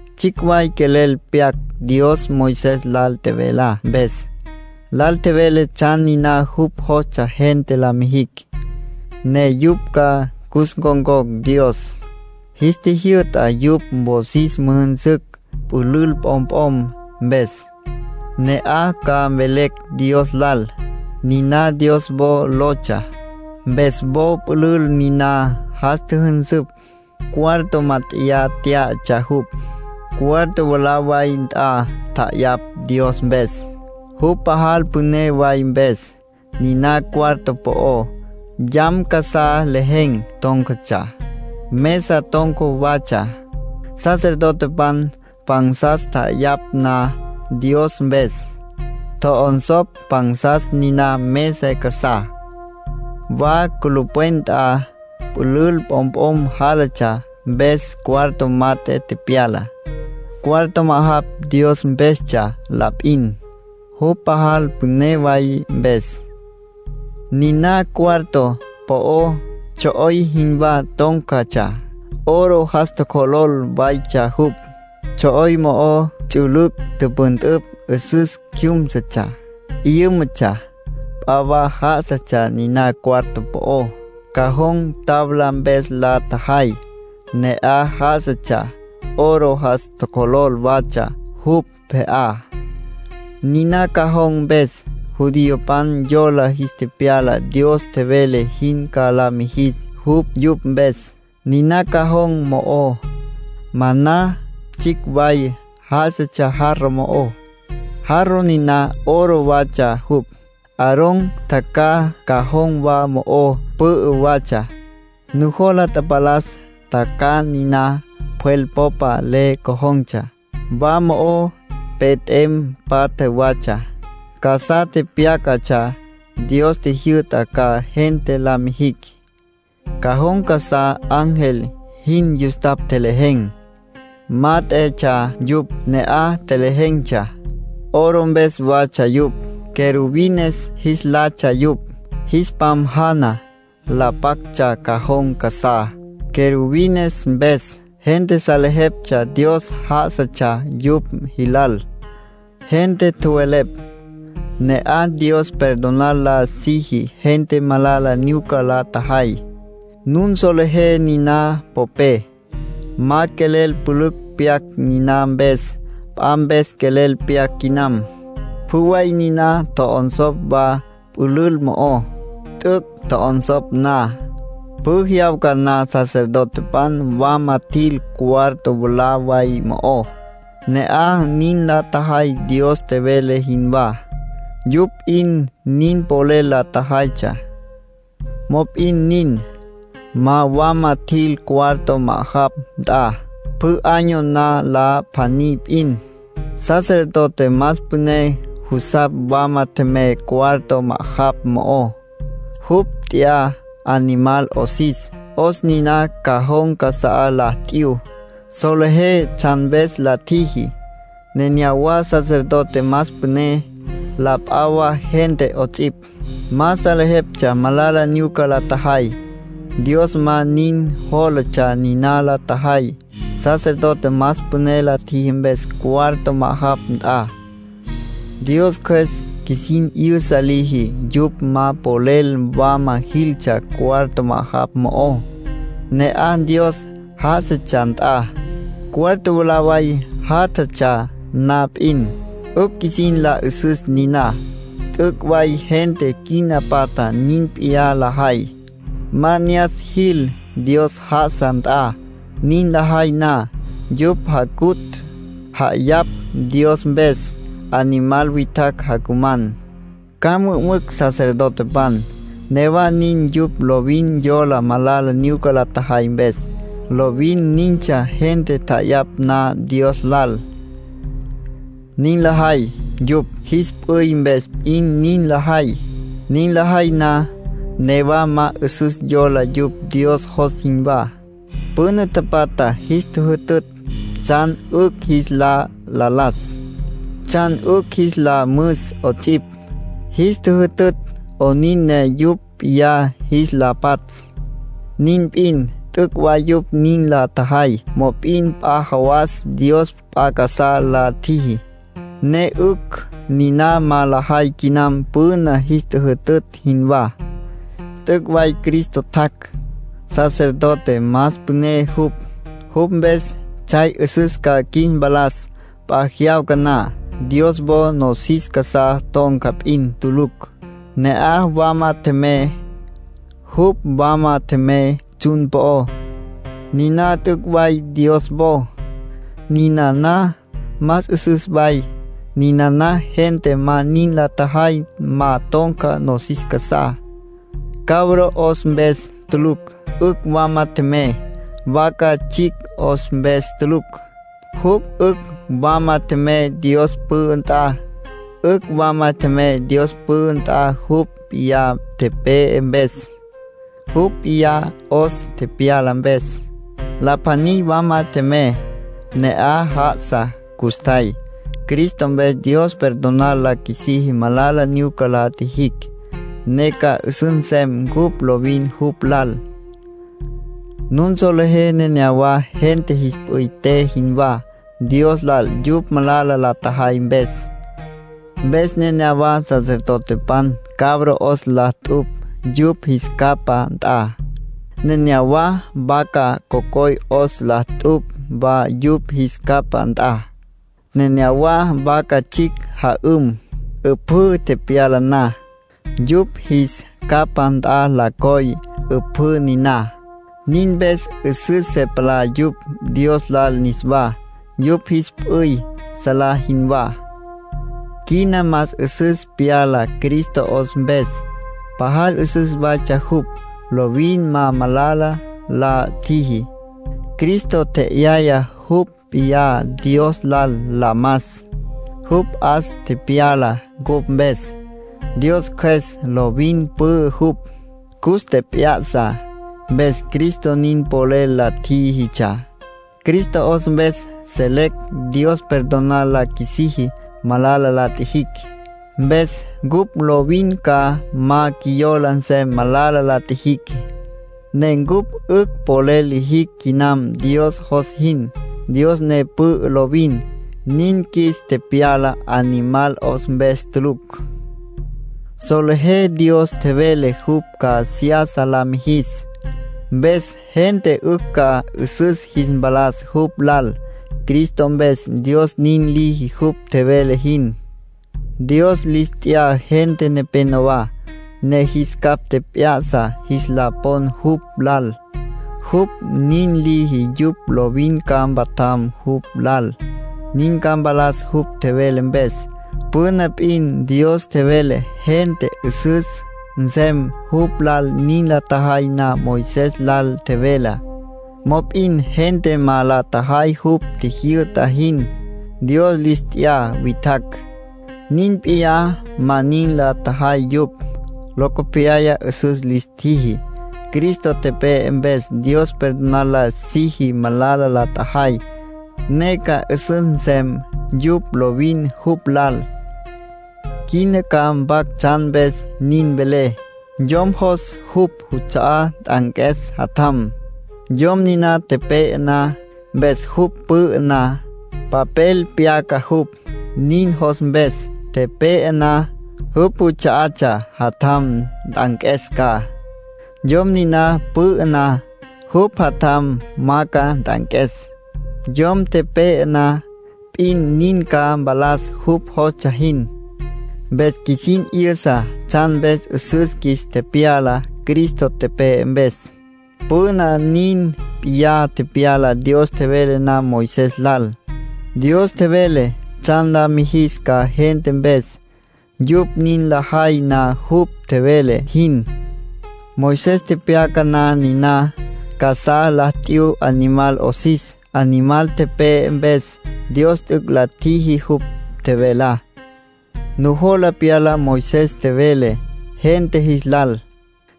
Tsjicj way quelel pyac Dios Moisés lal tjevelá mpes. Lal tjevele tsjan niná jupj jostsja gente la mijicj, ne yupj ca cus ncon̈cocj Dios. Jis tjijyü'ta yupj wosis müjünsücj pülül p'omp'om mpes, ne'aj ca mvelecj Dios lal. Niná Dios wo lotsja. Mpes wo pülül niná jas tjüjünsüpj. Cuarto mát'eya tyá'atsja jupj. Cuarto mwalá way nt'a tja'ayapj Dios mpes, jupj pajal püné way mpes. Niná cuarto po'ó, yam casá lejen̈ tón̈catsja, mesa ton̈ca watsja. Sacerdotepan pansas tja'ayapj na Dios mpes, tjo'onsopj pansas niná mesa casá. Wa culupwen nt'a, pülül p'omp'om jálatsja, mpes cuarto mat'e tepyala. Cuarto ma'ajapj Dios mpestsja la p'in, jupj pajal püné way mpes. Niná cuarto po'ó, tsjo'oy jinwá tón̈catsja, oro jas tjocjolol waytsja jupj. Tsjo'oy mo'ó ts'ülüc' tüpüntüpj 'üsüs cjúmsutsja, 'yǘmatsja. P'a wa já'asatsja niná cuarto po'ó. Cajón tabla mpes la tjajay, ne'aj já'asatsja, oro jas tjocjolol watsja jupj pje'á. Niná cajón mpes, judiopan yola jis tepyala Dios tjevele jin ca la mijis jupj yupj mpes. Niná cajón mo'ó, maná tsjicj way já'asatsja jarro mo'ó, jarro niná oro watsja jupj. Aarón tjacjaj cajón wa mo'ó pü'ü watsja. Nujola tapalas tjacjaj niná pjwel popa le cojon̈tsja. Wa mo'ó pe t'em patja watsja, casá tepyácatsja Dios tjijyü'tá ca gente la mijicj. Cajón casá ángel jin yustapj tjelejen̈, mát'etsja yupj, ne'aj tjelejen̈tsja. Oro mpes watsja yupj. Querubines jis latsja yupj. Jis pam jana, la pactsja cajón casá. Querubines mpes, gente salejeptsja Dios já'asatsja yupj jilal. Gente tjowelepj: “Ne'aj Dios perdonar la siji gente malala nyuca la tjajay”. Nun solejé niná popé. Ma quelel pülücj pyac niná mpes; p'a mpes quelel pyac quinam. Pjü way niná tjo'onsopj wa pülül mo'ó. T'üc' tjo'onsopj na, pjü jyawca na sacerdotepan wama tjil cuarto mwalá way mo'ó. Ne'aj nin la tjajay Dios tjevele jinwá; yupj p'in nin polel la tjajaytsja. Mop'in nin, ma wama tjil cuarto ma'ajapj nt'a. Pjü año na la pjaní p'in, sacerdote más püné jusapj wama tjemey cuarto ma'ajapj mo'ó. Jupj t'ya animal 'osis. 'Os niná cajón casá la t'yu. Solejé tsjan mpes la tjiji. Nenéyawa sacerdote más püné, la p'a wa gente 'ots'ipj, ma salejeptsja malala nyuca la tjajay. Dios ma nin jólatsja niná la tjajay, sacerdote más püné la tjiji mpes cuarto ma'ajapj nt'a. Dios Cjües qjuisin 'yüsa liji yupj ma polel wama jiltsja cuarto ma'ajapj mo'ó, ne'aj Dios já'asatsja nt'a, cuarto mwalá way jatatsja na p'in. 'Ücj qjuisin la 'üsüs niná. T'üc' way gente quina patja nin p'iyá lajay. Ma ne'as jil Dios já'asa nt'a nin lajay na. Yupj jacutj, ja'ayapj Dios mpes. Animal witjacj jacuman, ca mü'ümücj sacerdotepan. Newa nin, yupj lovin yola malala nyuca la tjajay mpes. Lovin nintsja gente tja'ayapj na Dios lal. Nin lajay, yupj jis p'üy mpes p'in nin lajay. Nin lajay na, newa ma 'üsüs yola yupj Dios jos jinwá. Püna tapatja jis tjüjütütj tsjan 'ücj jis la las, tsjan 'ücj jis la müs 'ots'ipj. Jis tjüjütütj 'onin ne yupj p'iyá jis la patsj. Nin p'in. T'üc' way yupj nin la tjajay, mop'in p'a jawas Dios p'a casá la tjiji, ne 'ücj niná ma lajay quinam püna jis tjüjütütj jinwá. T'üc' way Cristo tjac'. Sacerdote más püné jupj. Jupj mpes tsjay 'üsüs ca qjuis mpalas p'a jyawca na. Dios wo nosis casá ton̈ca p'in tulucj, ne'aj wama tjemey. Jupj wama tjemey tsjun po'ó. Niná t'üc' way Dios wo. Ninana más 'üsüs way, ninana gente ma nin la tjajay, ma ton̈ca nosis casá. Cabro 'os mpes tulucj 'ücj wama tjemey, vaca tsjicj 'os mpes tulucj, jupj 'ücj wama tjemey Dios pü'ü nt'a. 'Ücj wama tjemey Dios pü'ü nt'a jupj p'iyá tepe'e mpes, jupj p'iyá 'os tepyala mpes. La pjaní wama tjemey, ne'aj já'asa custjay. Cristo mpes Dios perdonar la qjuisiji malala nyuca la tjijicj, ne ca 'üsüs nsem cupj lovin jupj lal. Nun solejé nenéyawa gente jis p'üy te jinwá Dios lal yupj malala la tjajay mpes. Mpes nenéyawa sacerdotepan cabro 'os la t'upj yupj jis capá nt'a. Nenéyawa vaca cocoy 'os la t'upj wa yupj jis capá nt'a. Nenéyawa vaca tsjicj ja'üm. 'Üpjǘ tepyala na, yupj jis capá nt'a la coy 'üpjǘ niná. Nin mpes 'üsüs se palá yupj Dios lal niswá, yupj jis p'üy salá jinwá. Quina más 'üsüs pyala Cristo 'os mpes. Pajal 'üsüs waytsja jupj, lovin ma malala la tjiji. Cristo tje'yaya jupj p'iyá Dios lal la mas, jupj 'os tepyala cupj mpes. Dios Cjües, lovin pü'ü jupj, cus tjep'ya'sa, mpes Cristo nin polel la tjíjitsja. Cristo 'os mpes selecj Dios perdonar la qjuisiji malala la tjijicj. Mpes cupj lovin ca ma qjuiyola nsem malala la tjijicj, ne cupj 'ücj polel lijicj quinam Dios jos jin, Dios ne pü'ü lovin. Nin qjuis tepyala animal 'os mpes tulucj. Solejé Dios tjevele jupj ca seyasa la mijis, mpes gente 'ücj ca 'üsüs jis mpalas jupj lal. Cristo mpes Dios nin liji jupj tjevele jin. Dios lis t'ya gente nepénowa, ne jis capj tjep'ya'sa jis la pon jupj lal. Jupj nin liji yupj lovin ca mpatjam jupj lal. Nin ca mpalas jupj tjevele mpes. Püna p'in Dios tjevele gente 'üsüs nsem jupj lal nin la tjajay na Moisés lal tjevelá. Mop'in gente ma la tjajay jupj tjijyü'ta jin. Dios lis t'ya witjacj, nin p'iyá ma nin la tjajay yupj. Locopyaya 'üsüs lis tjiji. Cristo tepe'e, mpes Dios perdonar la siji malala la tjajay, ne ca 'üsüs nsem yupj lovin jupj lal. Quina ca mpac tsjan mpes nin velé. Yom jos jupj juts'a'á nt'anques jatjam, yom niná tepe'e na. Mpes jupj pü'ü na, papel pyaca jupj nin jos mpes. Tepe'e na, jupj juts'a'atsja jatjam nt'anques ca. Yom niná pü'ü na, jupj jatjam ma ca nt'anques. Yom tepe'e na p'in, nin ca mpalas jupj jostsja jin. Mpes qjuisin 'yüsa tsjan mpes 'üsüs qjuis tepyala Cristo tepe'e mpes. Püna, nin p'iyá tepyala Dios tjevele na Moisés lal. Dios tjevele tsjan la mijis ca gente mpes, yupj nin lajay na jupj tjevele jin. Moisés tepyaca na niná, casá la t'yu animal 'osis. Animal tepe'e mpes, Dios t'üc' la tjiji jupj tjevelá. Nujola pyala Moisés tjevele gente jis lal.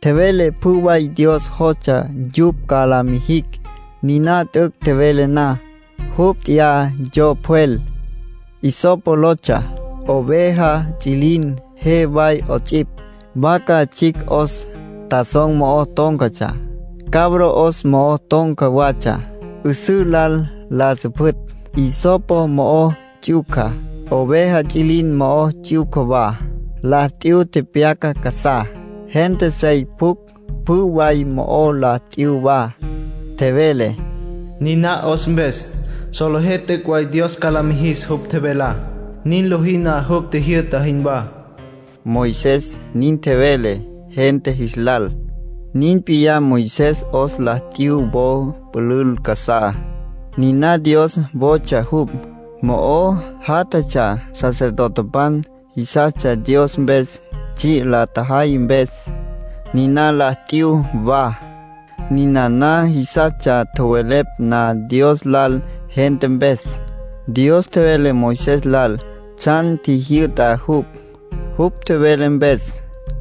Tjevele pjü way Dios jostsja yupj ca la mijicj. Niná t'üc' tjevele na, jupj nt'ya yo pjwel, hisopo lotsja, oveja ts'üilin je way 'ots'ipj. Vaca tsjicj 'os tazón mo'o tón̈catsja, cabro 'os mo'o ton̈ca watsja, 'üsǘ lal la süpjütj. Hisopo mo'o ts'yuca, oveja ts'üilin mo'o ts'yuca wa, la t'yu tepyacá casá. Gente sey pjucj pjü way mo'o la t'yu wa. Tjevele: “Niná 'os mpes, solejé t'üc' way Dios ca la mijis jupj tjevelá, nin lojí na jupj tjijyü'ta jinwá”. Moisés nin tjevele gente jis lal. Nin p'iyá, Moisés 'os la t'yu wo pülül casá, niná Dios wotsja jupj. Mo'o játjatsja sacerdotepan jisastsja Dios mpes tsji' la tjajay mpes; niná la t'yu wa. Ninana jisastsja tjowelepj na Dios lal gente mpes. Dios tjevele Moisés lal tsjan tjijyü'ta jupj. Jupj tjevele mpes,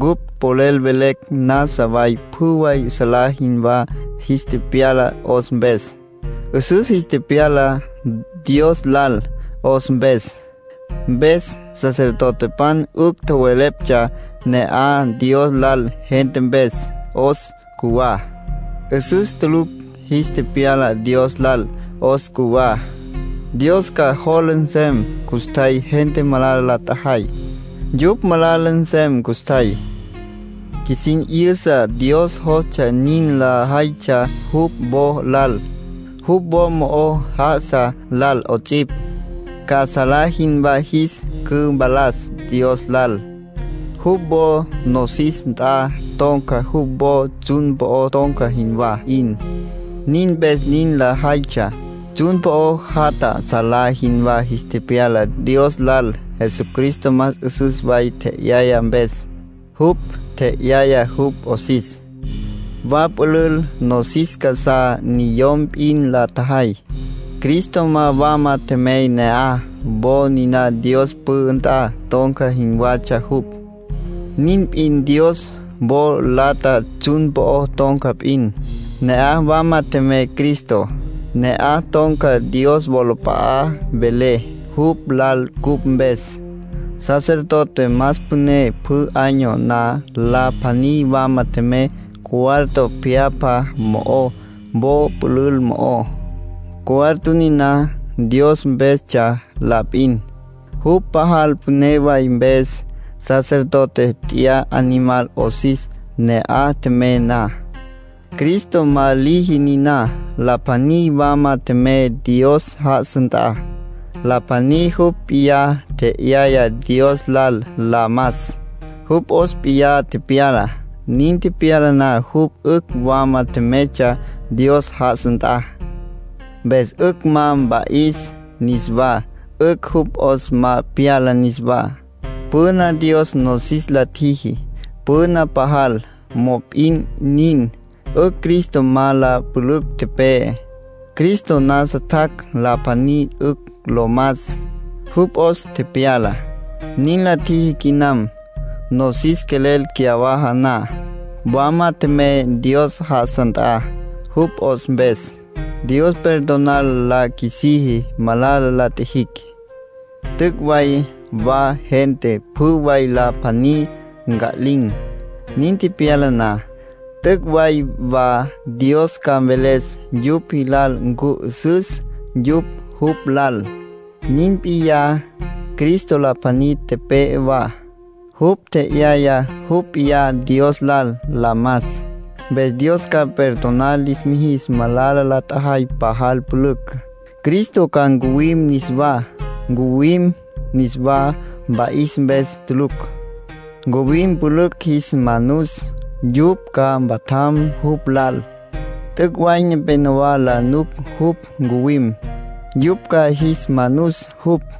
cupj polel velecj nasa way pjü way salá jinwá jis tepyala 'os mpes. 'Üsüs jis tepyala Dos lal 'os mpes. Mpes sacerdotepan 'ücj tjoweleptsja ne'aj Dios lal gente mpes. 'Os cjuwá, 'üsüs tulucj jis tepyala Dios lal. 'Os cjuwá, Dios ca jola nsem custjay gente malala la tjajay. Yupj malala nsem custjay. Qjuisin 'yüsa Dios jostsja nin lajaytsja jupj wo lal, jupj wo mo'o já'asa lal 'ots'ipj, ca salá jinwá jis cüpalas Dios lal. Jupj wo nosis nt'a ton̈ca jupj wo tsjun po'o ton̈ca jinwá 'in. Nin mpes nin lajaytsja. Tsjun po'o jatja salá jinwá jis tepyala Dios lal Jesucristo más 'üsüs way tje'yaya mpes. Jupj tje'yaya jupj 'osis. Wa pülül nosis casá, niyom p'in la tjajay; Cristo ma wama tjemey ne'aj. Wo niná Dios pü'ü nt'a ton̈ca jinwatsja jupj, nin p'in Dios wo lata tsjun po'o ton̈ca p'in. Ne'aj wama tjemey Cristo. Ne'aj ton̈ca Dios wolap'a'á, vele jupj lal cupj mpes. Sacerdote más püné pjü año na la pjaní wama tjemey cuarto pjyapja mo'ó wo pülül mo'ó. Cuarto niná Dios mpestsja la p'in, jupj pajal püné way mpes. Sacerdote t'ya animal 'osis ne'aj tjemey na. Cristo ma liji niná. La pjaní wama tjemey Dios já'asa nt'a. La pjaní jupj p'iyá tje'yaya Dios lal la mas; jupj 'os p'iyá tepyala. Nin tepyala na jupj 'ücj wama tjemeytsja Dios já'asa nt'a. Mpes 'ücj ma mpa'is niswá, 'ücj jupj 'os ma pyala niswá. Püna Dios nosis la tjiji. Püna pajal. Mop'in nin, 'ücj Cristo ma la pülücj tepe'e. Cristo nasa tjac' la pjaní 'ücj lo mas, jupj 'os tepyala. Nin la tjiji quinam, nosis quelel cyawaja na. Wama tjemey Dios já'asa nt'a. Jupj 'os mpes, Dios perdonar la qjuisiji malala la tjijicj. T'üc' way wa gente pjü way la pjaní nca'lin̈. Nin tepyala na, t'üc' way wa Dios ca mveles yupj jilal ncu 'üsüs yupj jupj lal. Nin p'iyá, Cristo la pjaní tepe'e wa. Jupj tje'yaya jupj p'iyá Dios lal la mas, mpes Dios ca perdonar lis mijis malala la tjajay pajal pülücj. Cristo ca ncuwim niswá. Ncuwim, niswa mpa'is mpes tulucj. Ncuwim pülücj jis manus, yupj ca mpatjam jupj lal. T'üc' way nepénowa la nuc jupj ncuwim. Yupj ca jis manus jupj.